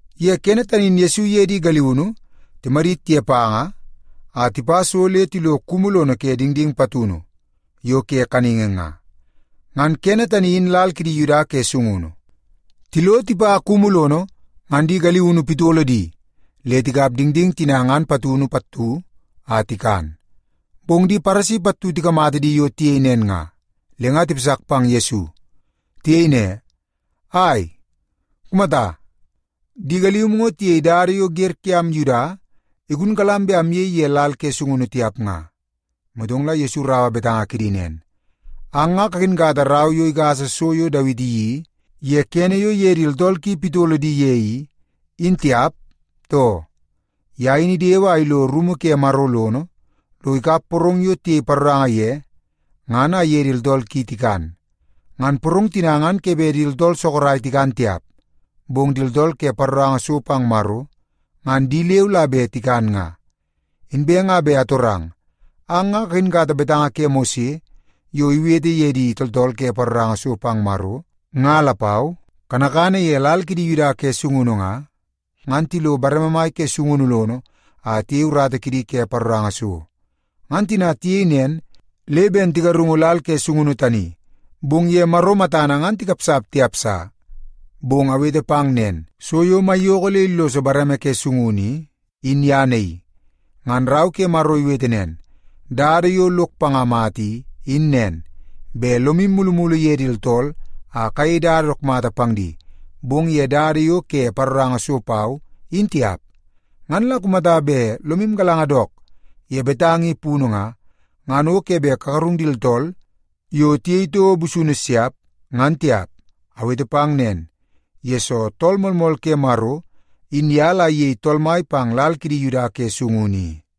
Ye kene tani in Yesu iye di galiunu timadit ye panga a tipa so le tilo kumu lono ke dingding patunu yo ke kaningi nga, ngan kene tani in lal kidi Yuda ke sungunu. Tilo tipa kumu lono, ngan di galiunu pitolo di le tikap dingding tina ngan patunu pattu a tikan. Bong di Paresi pattu tikamata di yo tiyei nen nga, le nga tipasak pang Yesu. Tiyei ne, “Ai, kumata! Di galium ngo tiyei dada yo wer kiam Yuda igunkalam bet amyei ye lal ke sungunu tiap nga.” Motong la Yesu iraua betanga kidi nen, “Ang nga kakinkata rau yo igasa so yo Dawiti iyeii ye kene yo iye di tooltool ki pitolo di ye i, in tiap, too? Ye in idewe a ilo rumu ke Maro lono, lo ikap porong yo tiyei paroranga ye ngan a iye di tooltool ki tikan. Ngan porong tina ngan ke bet di tooltool sorok tikan tiap, bong di tooltool ke paroranga so pang Maro, ngan di leu la bet tikan nga. Inbe nga bet atorang, ang nga kakinkata betanga ke Mose yo iwete ye di tooltool ke paroranga so pang Maro, nga lapau? Kanakana ye lal kidi Yuda ke sungunu nga, ngan tilo bareme mai ke sungunu lono a tiyei urata kidi ke paroranga so. Ngan tina tiyei nen, le ben tigarungu lal ke sungunu tani, bong ye Maro matana ngan tikapsap tiap sa. Bong awete pang nen, so yo maiyoko le illoso bareme ke sungunu i, in ye naii. Ngan Rau ke Maro iwete nen, ‘Dada yo lok panga mata i, in nen, bet lomu mulumulu ye di tooltool a kayei dada dook mata pang di, bong ye dada yo ke paroranga so pau, in tiap.’ Ngan la kumata bet lomu galanga dook ye betanga i punu nga, ngan o ke bet kagarung di tooltool yo tiyei toko busunu siap, ngan tiap. Awete pang nen, yesoo Tool Moolmool ke Maro, in ye la iyei Tool Mai pang lal kidi Yuda ke sungunu i.”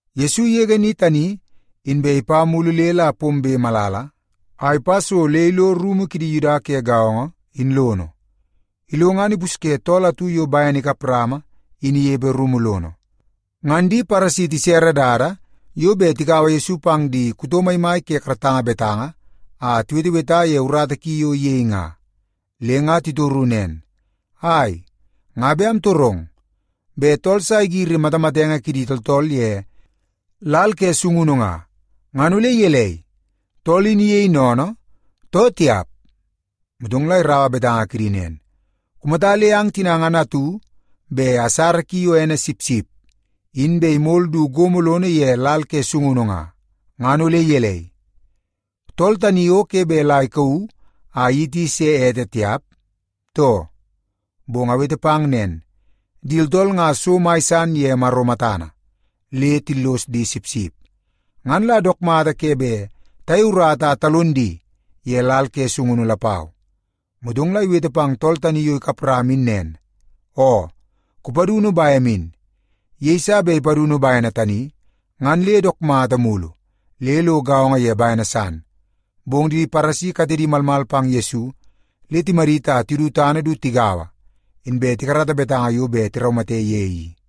Yesu igege ni tani, inbe ipa mulu le la pombe malala, a ipa so le ilo rumu kidi Yuda ke gaongo, in lono. Ilo ngan ipusye tool atu yo bene ikap rama in inepe rumu lono. Ngan di Paresi tisere dada yo bet tikaua Yesu pang ye di kuto maimai ke karatanga betanga a tiweteweta ye urata ki yo iyei nga. Le nga titoru nen, “Ai, nga bet amtorong. Bet tool sa igiri matamatenge kidi tooltool ye lal ke sungunu nga, ngan ole gelei, tool in iyei sennene, too tiap?” Motong la iraua betanga kidi nen, “Kumata le ang tina ngan atu bet asara ki yo ene sipsip in bet imol du gomo lono ye lal ke sungunu nga, ngan ole gelei, tool tani o ke bet la ikauu a iyiti se ete tiap, too? Bong awete pang nen, di tooltool nga so mai san ye Maro matana, le tillos di sipsip. Ngan la dook mata ke bet tayei urata a talon di ye lal ke sungunu lapau.” Motong la iwete pang tool tani yo ikap rama in nen, “Oo, kupadunu bem in.” Yeiso bet ipadunu bene tani, ngan le dook mata mulu le lo gaongo ye bene san. Bong di Paresi katedi malmal pang Yesu, le timadit a tidu tana du tigaua, inbe tikarata betanga yo bet tiraumate ye i.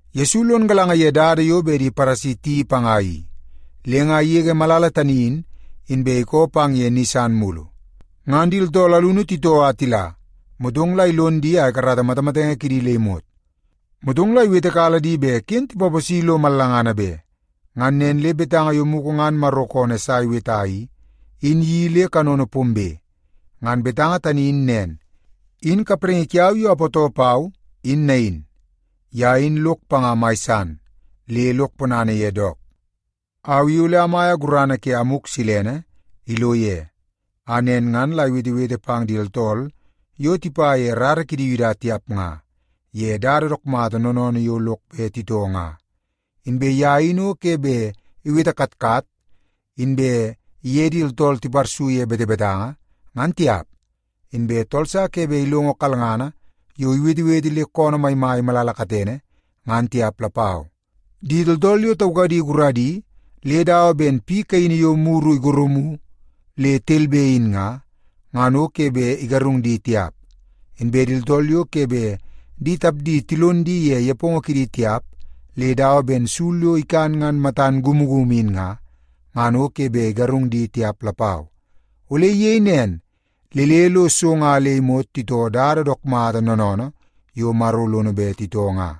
Yesu lon galanga ye dada yo bet di Paresi tiyeii panga i, le nga igege malala tani in, inbe ikoo pang ye ni san mulu. Ngan di tooltool alunu titoo a tila, motong la ilon di a ikarata matamatenge kidi le imot. Motong la iwetekala di bet ken tipaposi lo mallangana be. Ngan nen le betanga yo mugu ngan Maro koonoo Esai iweta i, in iyeii le kanono pombe. Ngan betanga tani in nen, “In kapraingi kiau yo apootoo pau in nain. Ye in lok panga mai san, le lok ponana ye dook. Au i ole amaia gurana ke Amuk Silene ilo ye, a nen ngan la iwetewete pang di tooltool yo tipa ye rara kidi Yuda tiap nga, ye dada dook mata noonoonoo yo lok bet titoo nga. Inbe ye in o ke bet iwete katkat, inbe iye di tooltool tiparsu ye betebetanga, ngan tiap. Inbe tool sa ke bet ilongo kalngana yo iwetewete le koonoo maimai malala katene, ngan tiap lapau. Di tooltool yo taukadi guradi le dawa ben piu kaini yo muru igorumu le telbe in nga, ngan o ke bet igarung di tiap. Inbe di tooltool yo ke bet di tapdi tilon di ye nepongo kidi tiap, le dawa ben sul yo ikan ngan matana kumukumu in nga, ngan o ke bet igarung di tiap lapau. Ole iyei nen le le lo so nga le imot titoo dada dook mata noonoonoo yo Maro lono bet titoo nga.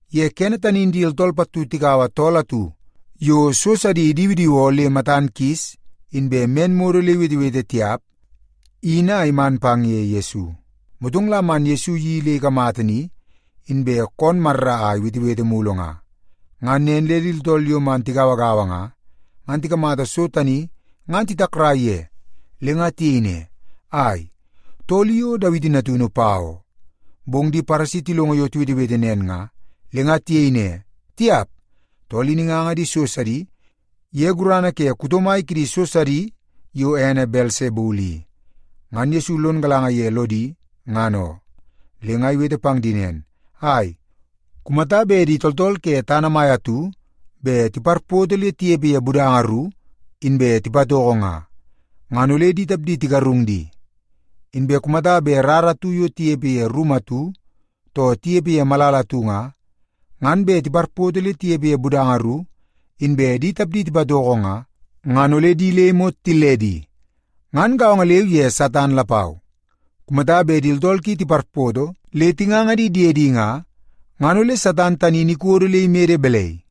Ye kene tani in di tooltool pattu tikaua tool atu yo so sidi idiwidiwoo le matan kis inbe men modo le iwetewete tiap i, in a iman pang ye Yesu. Motong la man Yesu iyeii le ikamata ni, inbe koon marra a iwetewete mulu nga. Ngan nen le di tooltool yo man tigauagaua nga, ngan tikamata so tani ngan titakrai ye. Le nga tiyei ne, “Ai, tool i o Dawiti Natunu, pa oo?” Bong di Paresi tilongo yo tiwetewete nen nga, le nga tiyei ne, “Tiap, tool in inganga di so sidi ye gurana ke kuto mai kidi so sidi yo ene Belsebul i.” Ngan Yesu lon galanga ye lodi, ngan oo. Le nga iwete pang di nen, “Ai, kumata bet di tooltool ke tana mai atu bet tiparpoto le tinepe ye budanga ru, inbe tipatoko nga, ngan ole di tapdi tigarung di. Inbe kumata bet rara atu yo tinepe ye rumu atu, too tinepe ye malala atu nga, ngan bet tiparpoto le tinepe ye budanga ru, inbe di tapdi tipatoko nga, ngan ole di le imot tilledi. Ngan gaongo leu ye Satan lapau. Kumata bet di tooltool ki tiparpoto le tinganga di diedi nga, ngan ole Satan tani in ikodo le imede balai?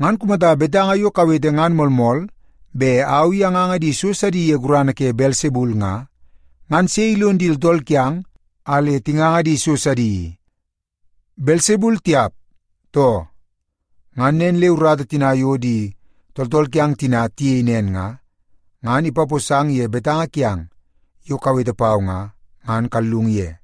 Ngan kumata betanga yo kawete ngan moolmool bet au i anganga di so sidi ye gurana ke Belsebul nga, ngan sei ilon di tooltool kiang a le tinganga di so sidi i? Belsebul tiap, too? Ngan nen le urata tina yo di tooltool kiang tina tiyei nen nga, ngan ipaposang ye betanga kiang yo kawete pau nga, ngan kallung ye.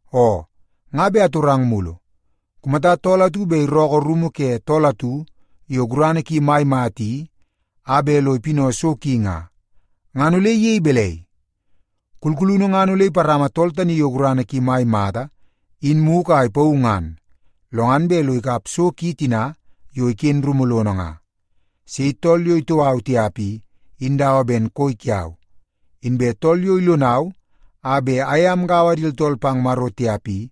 “Oo, nga bet atorang mulu. Kumata tool atu bet irookoo rumu ke tool atu yo gurana ki mai mata i a bet lo ipinau so ki nga, ngan ole iyei balai? Kulkulunu ngan ole iparama tool tani yo gurana ki mai mata in mugu a ipauu ngan, lo ngan bet lo ikap so ki tina yo iken rumu lono nga. “Sei tool yo itoo au tiap i, in dawa ben koi kiau. Inbe tool yo ilonau a bet aye amgaua di tooltool pang Maro tiap i,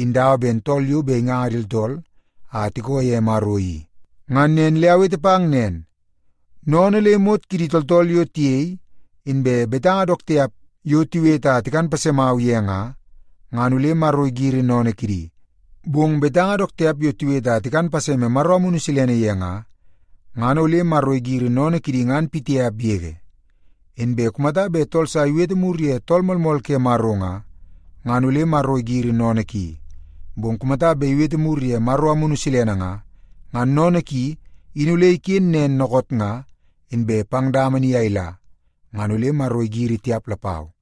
in dawa ben tool yo bet inganga di tooltool a tikoo ye Maro i. Ngan nen le awete pang nen, sennene le imot kidi tooltool yo tiyei, inbe betanga dook tiap yo tiwete a tikan pasemau ye nga, ngan ole Maro igiri sennene kidi. Bong betanga dook tiap yo tiwete a tikan paseme Maro Amunu Silene ye nga, ngan ole Maro igiri sennene kidi ngan pitiap yege. Inbe kumata bet tool sa iwete mur ye Tool Moolmool ke Maro nga, ngan ole Maro igiri sennene ki. Bong kumata bet iwete mur ye Maro Amunu Silene nga, ngan sennene ki in ole iken nen dookoot nga, inbe pang dama ni a ila, ngan ole Maro igiri tiap lapau.”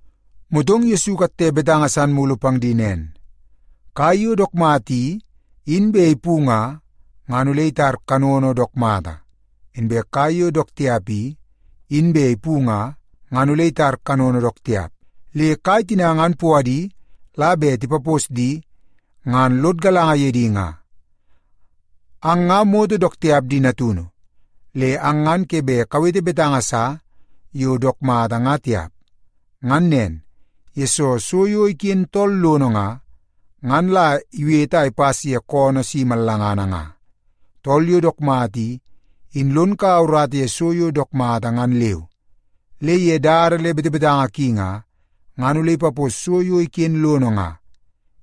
Motong la Yesu ikatte betanga san mulu pang di nen, “Kai yo dook mata i, in bet ipu nga, ngan ole itar kanono dook mata. Inbe kai yo dook tiap i, in bet ipu nga, ngan ole itar kanono dook tiap. Le kai tina ngan puadi la bet tipapos di, ngan lod galanga ye di nga. Ang nga moto dook tiap di natunu! Le ang ngan ke bet kawete betanga sa yo dook mata nga tiap. Ngan nen, yesoo so yo iken tool lono nga, ngan la iwete a ipas ye koonoo si mallangana nga. Tool yo dook mata i, in lon kaua urata ye so yo dook mata ngan leu, le ye dada le betebetanga ki nga, ngan ole ipapos so yo iken lono nga.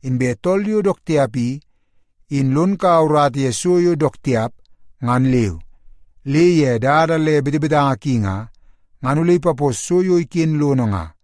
Inbe tool yo dook tiap i, in lon kaua urata ye so yo dook tiap ngan leu, le ye dada le betebetanga ki nga, ngan ole ipapos so yo iken lono nga.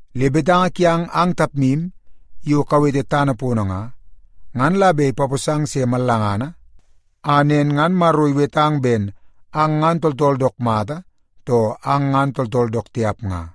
Le betanga kiang ang tapmu yo kawete tana pono nga, ngan la bet ipaposang se mallangana a nen ngan Maro iwetang ben ang ngan tooltool dook mata, too ang ngan tooltool dook tiap nga.”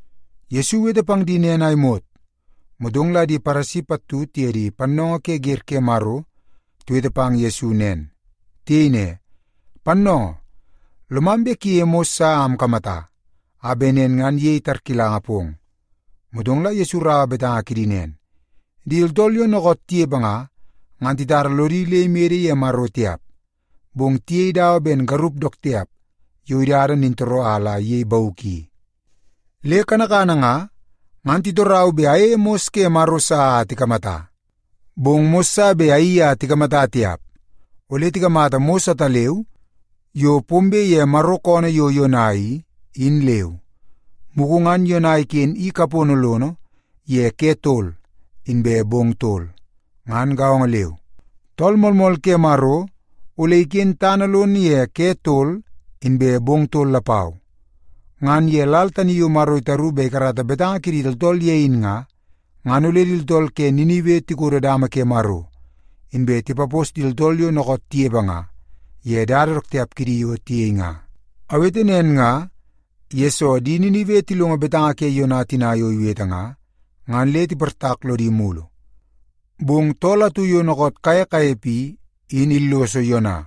Yesu iwete pang di nen a imot, motong di Paresi pattu tiye di pannoongoo ke wer ke Maro tiwete pang Yesu nen. Tiyei ne, “Pannoongoo, lomam bet kuyeie mos sa a amkamata, a bet nen ngan iyei tarkilanga pong.” Motong la Yesu iraua betanga kidi nen, “Di tooltool yo dookoot tinepe nga, ngan titara lodi le imede ye Maro tiap, bong tiyei dawa ben garup dook tiap yo idada nintooroo a la iyei bauk i. Le kanakana nga, ngan titorau bet ayeie mos ke Maro sa a tikamata. Bong mos sa bet ayeii a tikamata tiap. Ole tikamata mos ataleu yo pombe ye Maro koonoo yo Yona i, in leu. Mugu ngan Yona iken i kapono lono ye ke tol inbe bong tol. Ngan gaongo leu, Tool Moolmool ke Maro ole iken tana lono ye ke tol inbe bong tol lapau. Ngan ye lal tani yo Maro itaru bet ikarata betanga kidi tooltool ye in nga, ngan ole di tooltool ke Ninibe tikodo dama ke Maro, inbe tipapos di tooltool yo dookoot tinepe nga, ye dada dook tiap kidi yo tiyei nga. Awete nen nga, yesoo di Ninibe tilongo betanga ke Yona tina yo iwete nga, ngan le tiportak lodi mulu. Bong Tool atu yo dookoot kaye kanepe i, in illoso Yona.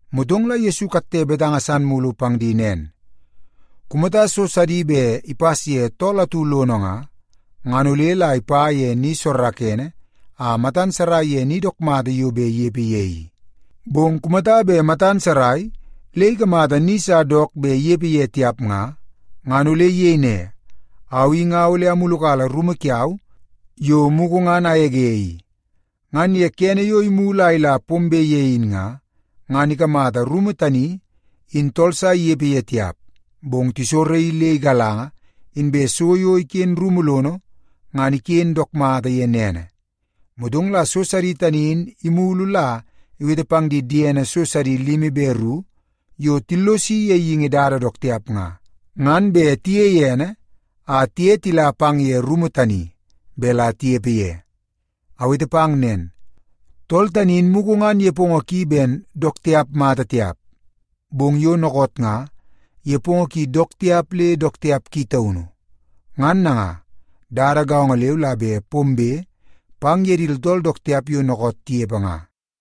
Motong la Yesu ikatte betanga san mulu pang di nen, “Kumata so sidi bet ipas ye tool atu lono nga, ngan ole la ipa ye ni soorookoonoo a matan sarai ye ni dook mata yo bet inepe ye i. Bong kumata bet matan sarai le ikamata ni sa dook bet inepe ye tiap nga, ngan ole iyei ne, ‘Au i nga ole amulukala rumu kiau yo mugu ngan agege i.’ Ngan kene yo imulu a ila pombe ye in nga, ngan ikamata rumu tani in tool sa inepe ye tiap, bong tisoraii le igalanga, inbe so yo iken rumu lono ngan iken dook mata ye nene. Motong la so sidi tani in imulu la iwete pang di diene so sidi limi be ru yo tillosi ye geingi dada dook tiap nga, ngan bet tiyei ene a tiye tila pang ye rumu tani bet la tinepe ye. Awete pang nen, tool tani in mugu ngan nepongo ki ben dook tiap mata tiap, bong yo dookoot nga nepongo ki dook tiap le dook tiap ki taunu. Ngan nanga, dada gaongo leu la bet pombe pang ye di tooltool dook tiap yo dookoot tinepe nga.”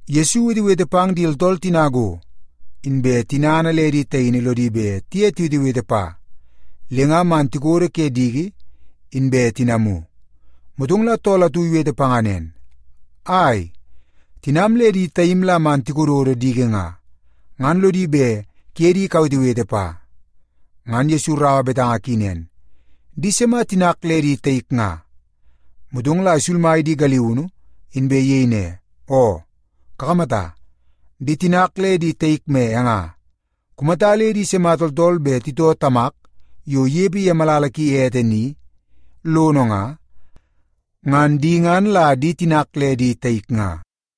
Yesu iwetewete pang di tooltool tina go, inbe tinana le di taini lodi bet tiye tiwetewete pa, le nga man tikodo ke diki, inbe tinamu. Motong la tool atu iwete panga nen, “Ai, tinam le di taim la man tikododo diki nga, ngan lodi bet kuye di kawetewete pa.” Ngan Yesu iraua betanga ki nen, “Di sima tinak le di taik nga?” Motong la isulmai di galiunu, inbe iyei ne, “Oo, kakamata, di tinak le di taik me e nga. Kumata le di sima tooltool bet titoo Tamak yo inepe ye malala ki ete ni i, in lono nga, ngan di ngan la di tinak le di taik nga.”